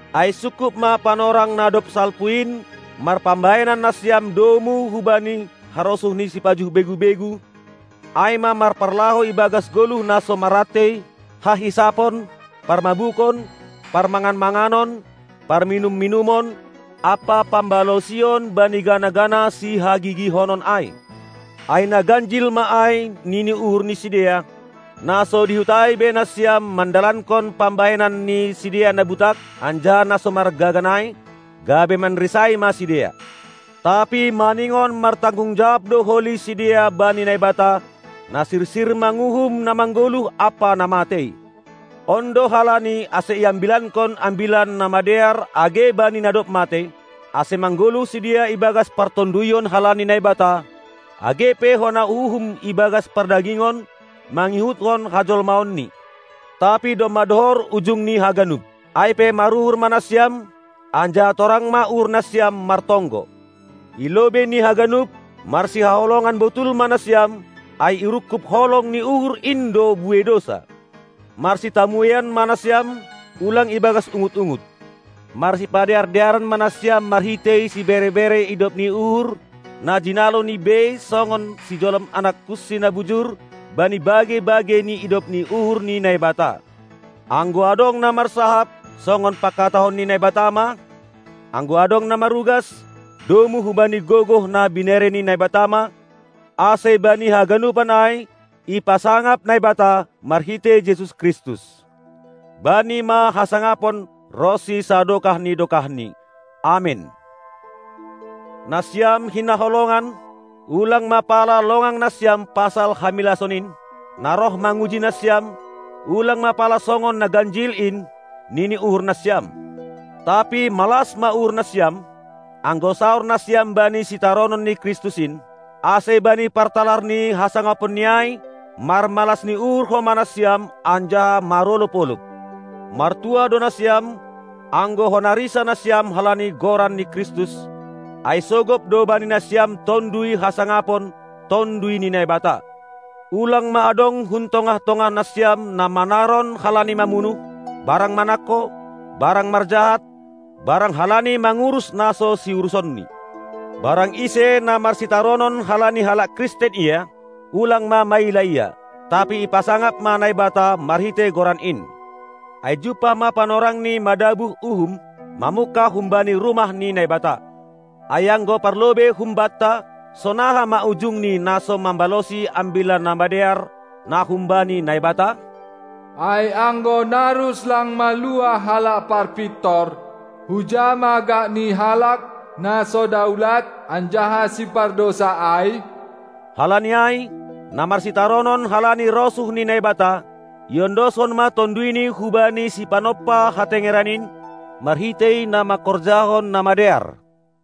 Ai sungkup ma panorang na dob salpu in marpambahenan nasiam domu hubani harosuh ni sipajuh begu-begu, ai ma marparlahou ibagas goluh na so marrantei, hahisapon, parmabukon, parmangan-manganon, parminum-minumon, ampa pambalosion bani gana-gana sihagigihonon ai. Ai na ganjil ma ai nini uhur ni sidea, na so dihut ai be nasiam mandalankon pambahenan ni sidea na butak anjaha na so margagan ai, gabe manrisai ma sidea. Tapi maningon martanggung jawab do holi sidea bani Naibata, na sirsir manguhum na manggoluh ampa na matei. On do halani ase iambilankon Ambilan Namadear age bani na dob matei, ase manggoluh sidea ibagas partonduyon halani Naibata, age pe hona uhum ibagas pardagingon mangihutkon hajolmaonni. Tapi domma dohor ujung ni haganup. Ai pe maruhur ma nasiam, anjaha torang ma uhur nasiam martonggo. I lobei ni haganup, marsihaholongan botul ma nasiam, ai irungkub holong ni uhur in do buei dousa. Marsitamueian ma nasiam, ulang ibagas ungut-ungut. Marsipadear-dearan ma nasiam marhitei sibere-bere idop ni uhur na jinaloni bei songon sijolom anakkunsi na bujur bani bagei-bagei ni idop ni uhur ni Naibata. Anggo adong na marsahap songon pangkatahon ni Naibata ma, anggo adong na marugas, domu hubani gogoh na binere ni Naibata ma, ase bani haganupan ai ipasangap Naibata marhitei Jesus Kristus. Bani ma hasangapon ronsi sadokah ni dokahni. Amen. Nasiam hinaholongan, ulang ma pala longang nasiam pasal hamilason in, na roh manguji nasiam; ulang ma pala songon na ganjil in, nini uhur nasiam. Tapi malas ma uhur nasiam, anggo saor nasiam bani sitaronon ni Kristus in, ase bani partalar ni hasangaponNi ai marmalas ni uhur homa nasiam anjaha marolob-olob. Martuah do nasiam, anggo hona risa nasiam halani goran ni Kristus, ai sogop do bani nasiam Tonduy Hasangapon, Tonduy ni Naibata. Ulang ma adong hun tongah-tongah nasiam na manaron halani mamunuh, barang manangko, barang marjahat, barang halani mangurus na so siurusonni. Barang ise na marsitaronon halani halak Kristen ia, ulang ma maila ia, tapi ipasangap ma Naibata marhitei goran in. Ai jumpah ma panorangni madabuh uhum, mamungkah humbani rumah ni Naibata. Ai anggo parlobei humbanta, sonaha ma ujung ni na so mambalosi Ambilan Namadear, na humbani Naibata? Ai anggo narus lang maluah halak parpintor, huja ma gakni halak na so daulat anjaha sipardousa ai? Halani ai, na marsitaronon halani rosuh ni Naibata, iondoskon ma tonduyni hubani Sipanompa hatengeran in, marhitei na manghorjahon na madear.